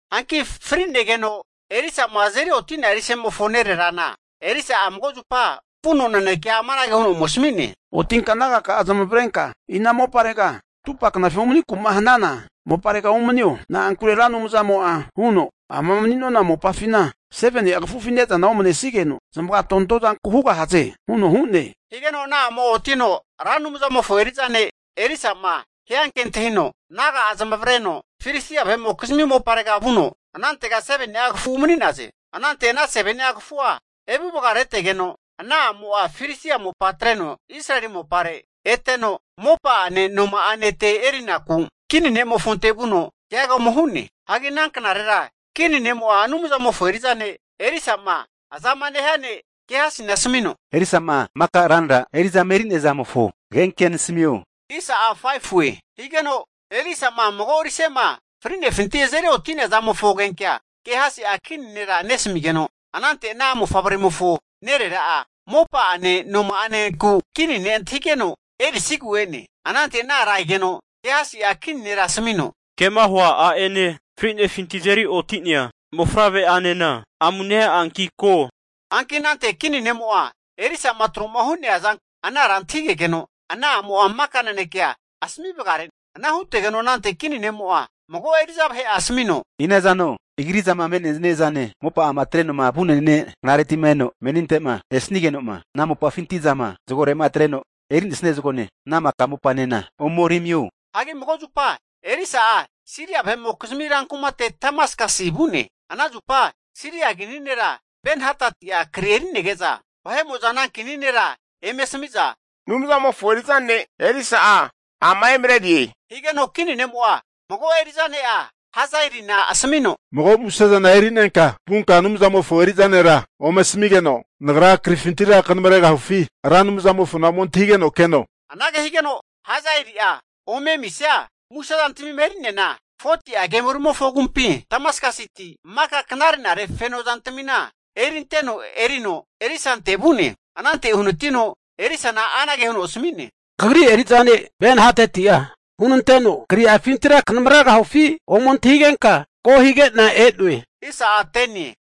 Hanki fri'negeno Elisa'ma azeri oti'nea rise'mofo nererana, Elisa'a mago zupa vuno nanekea amanage huno ome asami'ne, Otinka nagaka'a zamavarenka ina moparega atupa knafi umaniku'ma hanana moparega umanio. Na'ankure Ra Anumzamo'a huno, amama mani'nona mopafina 7ni'a kafufi ne'zana omanenesigeno zamaga tontozanku hugahaze huno hu'ne. Higeno ana a'mo'a otino Ra Anumzamofo eri'za ne' Elisa'ma hianke antahino, naga'a zamavareno Filistia vahe'mokizmi moparega vu'za, anantega 7ni'a kafu umani'naze. Anante ana 7ni'a kafua evuvagaretegeno, ana a'mo'a Filistia mopa atreno, Israeli mopare eteno, mopa'ane noma'ane ete erinaku kini ne'mofonte vuno keaga ome hu'ne. Hagi ana knarera kini ne'mo'a Anumzamofo eri'za ne' Elisama azama nehia ne' Gehasina asmino, Elisa'ma maka ranra eri'zama eri'nea zamofo agenkea nasmio. Higeno Elisa'ma mago rise'ma fri'nefinti azeri oti'nea zamofo agenkea Gehasi'a kini nera nesamigeno, anante ana mofavremofo nerera'a, mopa'ane noma'anenku kini ne' antahigeno erisigu e'ne. Anante ana ara egeno Gehasi'a kini nera asmino, kema hua a'ene, fri'nefinti'ma azeri oti'nea mofavre'anena amu nea'anki ko. Hanki anante kini ne'mo'a Elisa'ma tro'ma hu'nea zanku ana ara antahigegeno, ana a'mo'a maka nanekea asmi vagare'ne. Ana hutegeno anante kini ne'mo'a mago eri'za vahe'a asmino, inazano agri'zama mene'niazane, mopa'ama atreno vu'nenia knareti'ma eno meninte'ma esnigeno'ma, ana mopafinti zama zagore'ma atreno eri'nesia zagone, ana maka mopanena ome eri amio. Hanki mago zupa Elisa'a Siria vahe'mokizmi rankumate Damaskasi vu'ne. Ana zupa Siria kini nera Ben-Hadati'a kri eri'nege'za, ana kini nera eme asami'za, Anumzamofo eri'za ne' Elisa'a ama emarerie. Higeno kini ne'mo'a mago eri'za ne'a Hazaelina asmino, Mago musezana eri'nenka vunka Anumzamofo eri'za nera ome asamigeno nagra krifintira kanamregahufi, Ra Anumzamofona ome antahigeno keno. Anage higeno Hazaeli'a ome amisia muse zantamima eri'neana, 40'a kemolimofo agumpi Damaskasiti maka knare'nare feno zantamina erinteno erino Elisante vu'ne. Anante uhanatiteno Elisana anage huno asmi'ne, Kagri eri'za ne' Ben-Hatati'a hunanteno, kri'afintira kanamregahufi ome antahigenka ko hige'na e'noe.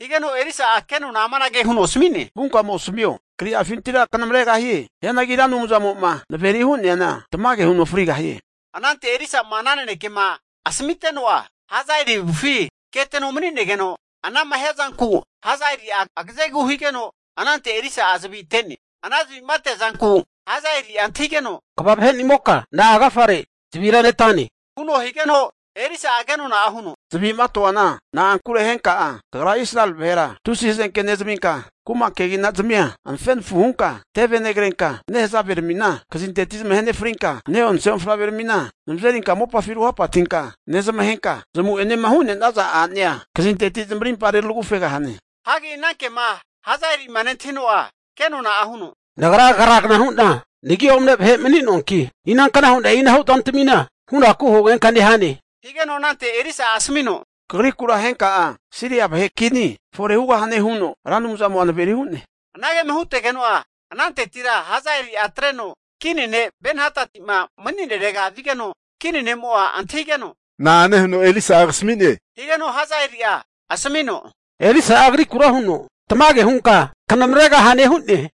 Higeno Elisa'a kenona'a amanage huno asmi'ne, Vunka ome asmio, kri'afintira knamaregahie. Hianagi Ra Anumzamo'ma naveri hu'neana tamage huno frigahie. Anante Elisa'ma ana nanekema asmiteno'a, Hazaeli avufi keteno mani'negeno anama hiazanku Hazaeli'a agazegu higeno, anante Elisa'a zavi ate'ne. Ana zavi'ma ateazanku, Hazaeli'a antahigeno, Kva vahenimoka na'a agafare zavira netane, huno higeno Elisa'a kenona'a huno, Zavi'ma toana na'ankure henka'a kagra Israeli vahera tusi hazenke nezaminka, kuma kegina'zamia anafenafu hunka teve negrenka, nehazaveramina kazinteti zamahe nefrinka, ne'onse mofavreramina zamazerinka mopafi ruhapatinka nezamahenka, zamu'enema hu'nenaza a'nea kazinteti zamarimpa retragufegahane. Hagi ana kema Hazaeli'ma nentahino'a kenona'a huno, Nagra kragna hu'na nagi omne vahe mani'noanki, inankna hu'na e'inahu zantamina hunaku hugenka nehane. Higeno anante Elisa'a asmino, Kagrikura henka'a Siria vahe kini fore hugahane huno Ra Anumzamo'a naveri hu'ne. Anagema hutegeno'a, anantetira Hazaeli'a atreno kini ne' Ben-Hadati'ma mani'nerega vigeno, kini ne'mo'a antahigeno, Na'ane huno Elisa'a kasami'ne. Higeno Hazaeli'a asmino, Elisa'a kagrikura huno, tamage hunka knamregahane hu'ne.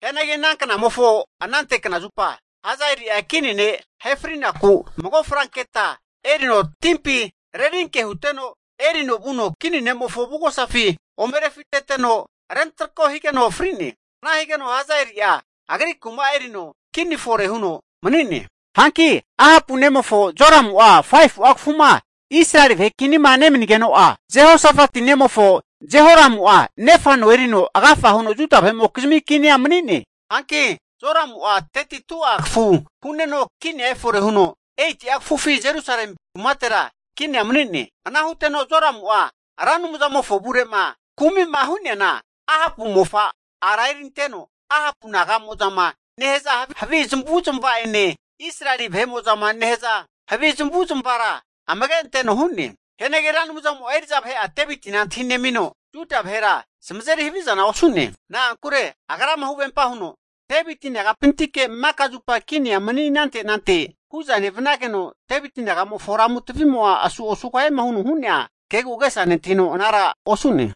Hianagi ana knamofo anante knazupa, Hazaeli'a kini ne ahefrinaku, mago franketa erino timpi rerinke huteno, erino vuno kini ne'mofo avugosafi ome rufiteno rentrako higeno fri'ne. Ana higeno Hazaeli'a agri kuma erino kini fore huno mani'ne. Hanki Ahapu nemofo, Joramu'a 5fu'a kafuma Israeli vahe kinima nemanigeno'a, Jehosafati nemofo Jehoramu'a nefa no erino, agafa huno Juda vahe'mokizmi kinia mani'ne. Hanki Joramu'a 32'a kafu hu'neno kinia efore huno, 8'a kafufi Jerusalemi kumatera kinia mani'ne. Ana huteno Joramu'a, Ra Anumzamofo avure'ma kumi'ma hu'neana, Ahapu mofa ara eriteno, Ahapu naga'mo'zama nehaza havi zamavu'zmava'ene, Israeli kini vahe'mo'zama nehaza havi zamavu'zmavara zamage anteno hu'ne. Hianagi Ra Anumzamo'a eri'za vahe'a Devitina antahinemino, Juda vahera zamazeri havizana osu'ne. Na'ankure Agrama huvempa huno, Deviti naga'pintike maka zupa kinia mani anante nante hu'za nevanageno, Deviti nagamofo lamu tavimo'a asu osugahiema huno hu'nea kegu agesa nentahino anara osu'ne.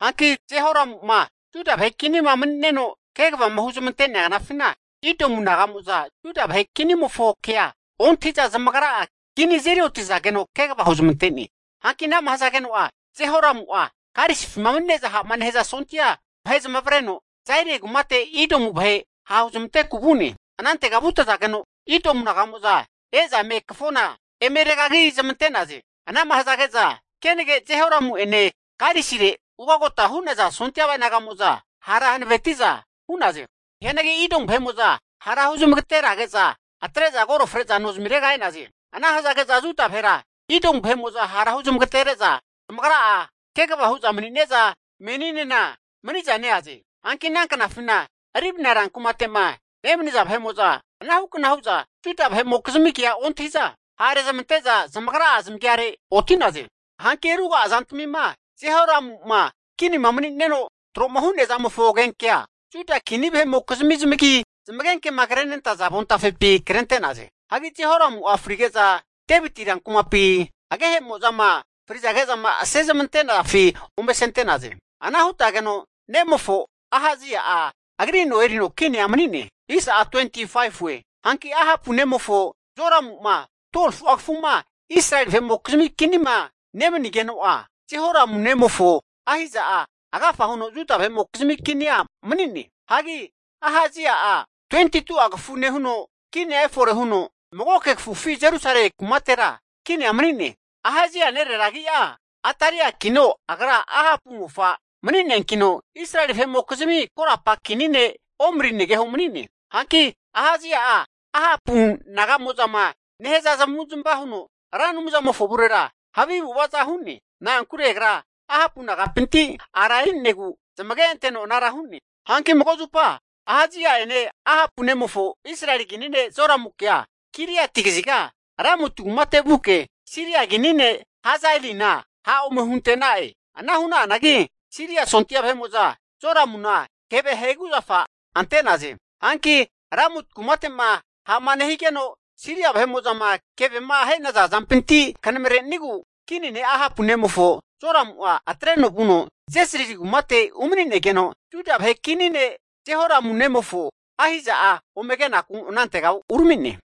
Hanki Jehoramu'ma Juda vahe kinima mani'neno kegavama huzmante'nea knafina, Idomu vahe'mo'za Juda vahe kinimofo kea ontahi'za zamagra'a kini azeri oti'zageno kegava huzmante'ne. Hanki anama hazageno'a, Jehoramu'a karisifima mani'ne'za ha'ma nehaza sondia vahe zamavareno, Zairi kumate Idomu vahe ha' huzmanteku vu'ne. Anantega vutazage'za Idomu vahe'mo'za e'za kafona eme regagi zamante'naze. Anama hazage'za, kenage Jehoramu'ene karisire ugota hu'naza sondia vahe'mo'za hara hanaveti'za hu'naze. Hianagi Idomu vahe'mo'za hara huzmagaterage'za atre'za koro fre'za nozamirega e'naze. Ana hazage'za Juda vahera, Idomu vahe'mo'za hara hu zamagatere'ne'za zamagra'a kegava hu'za mani'ne'za meninena mani'za neaze. Hanki ana knafina Libna ran kumate'ma nemaniza vahe'mo'za anahukna hu'za Juda vahe'mokizmi kea ontahi'za ha' rezmante'za zamagra'a zamagiare oti'naze. Hanki ruga'a zantamima Jehoramu'ma kinima mani'neno tro'ma hu'nea zamofo agenkea, Juda kini vahe'mokizmi zamagi zamagenkema krenentaza avontafepi krente'naze. Hagi Jehoramu'a frige'za, Deviti rankumapi agehemozama frizage'zama asezmante'nafi ome asente'naze. Ana hutegeno nemofo Ahazia'a agri no erino kinia mani'ne. Hanki Ahapu nemofo, Joramu'ma 12fu'a kafuma Israeli vahe'mokizmi kinima nemanigeno'a, Jehoramu nemofo Ahazia'a agafa huno Juda vahe'mokizmi kinia mani'ne. Hagi Ahazia'a 22'a kafu nehuno, kinia efore huno, magoke kafufi Jerusalemi kumatera kinia mani'ne. Ahazia nerera agi'a Atalia'kino agra Ahapu mofa mani'neankino, Israeli vahe'mokizmi korapa kini ne' Omri negeho mani'ne. Hanki Ahazia'a Ahapu naga'mo'zama nehaza zamavu'zmava huno, Ra Anumzamofo avurera havi avu'avaza hu'ne. Na'ankure agra Ahapu naga'pinti ara eri'negu zamage anteno anara hu'ne. Hanki mago zupa Ahazia'ene, Ahapu nemofo Israeli kini ne Joramukea, Giliati kaziga Ramoti kumate vuke, Siria kini ne' Hazaelina ha' ome hunte'na'e. Ana hu'na'anagi Siria sondia vahe'mo'za Joramuna keve aheguzafa ante'naze. Hanki Ramoti kumate'ma ha'ma nehigeno Siria vahe'mo'zama kevema ahe'naza zampinti knamrenigu kini ne' Ahapu nemofo Joramu'a atreno vuno Jezrili kumate umani'negeno, Juda vahe kini ne' Jehoramu nemofo Ahazia'a ome kenaku anantega urami'ne.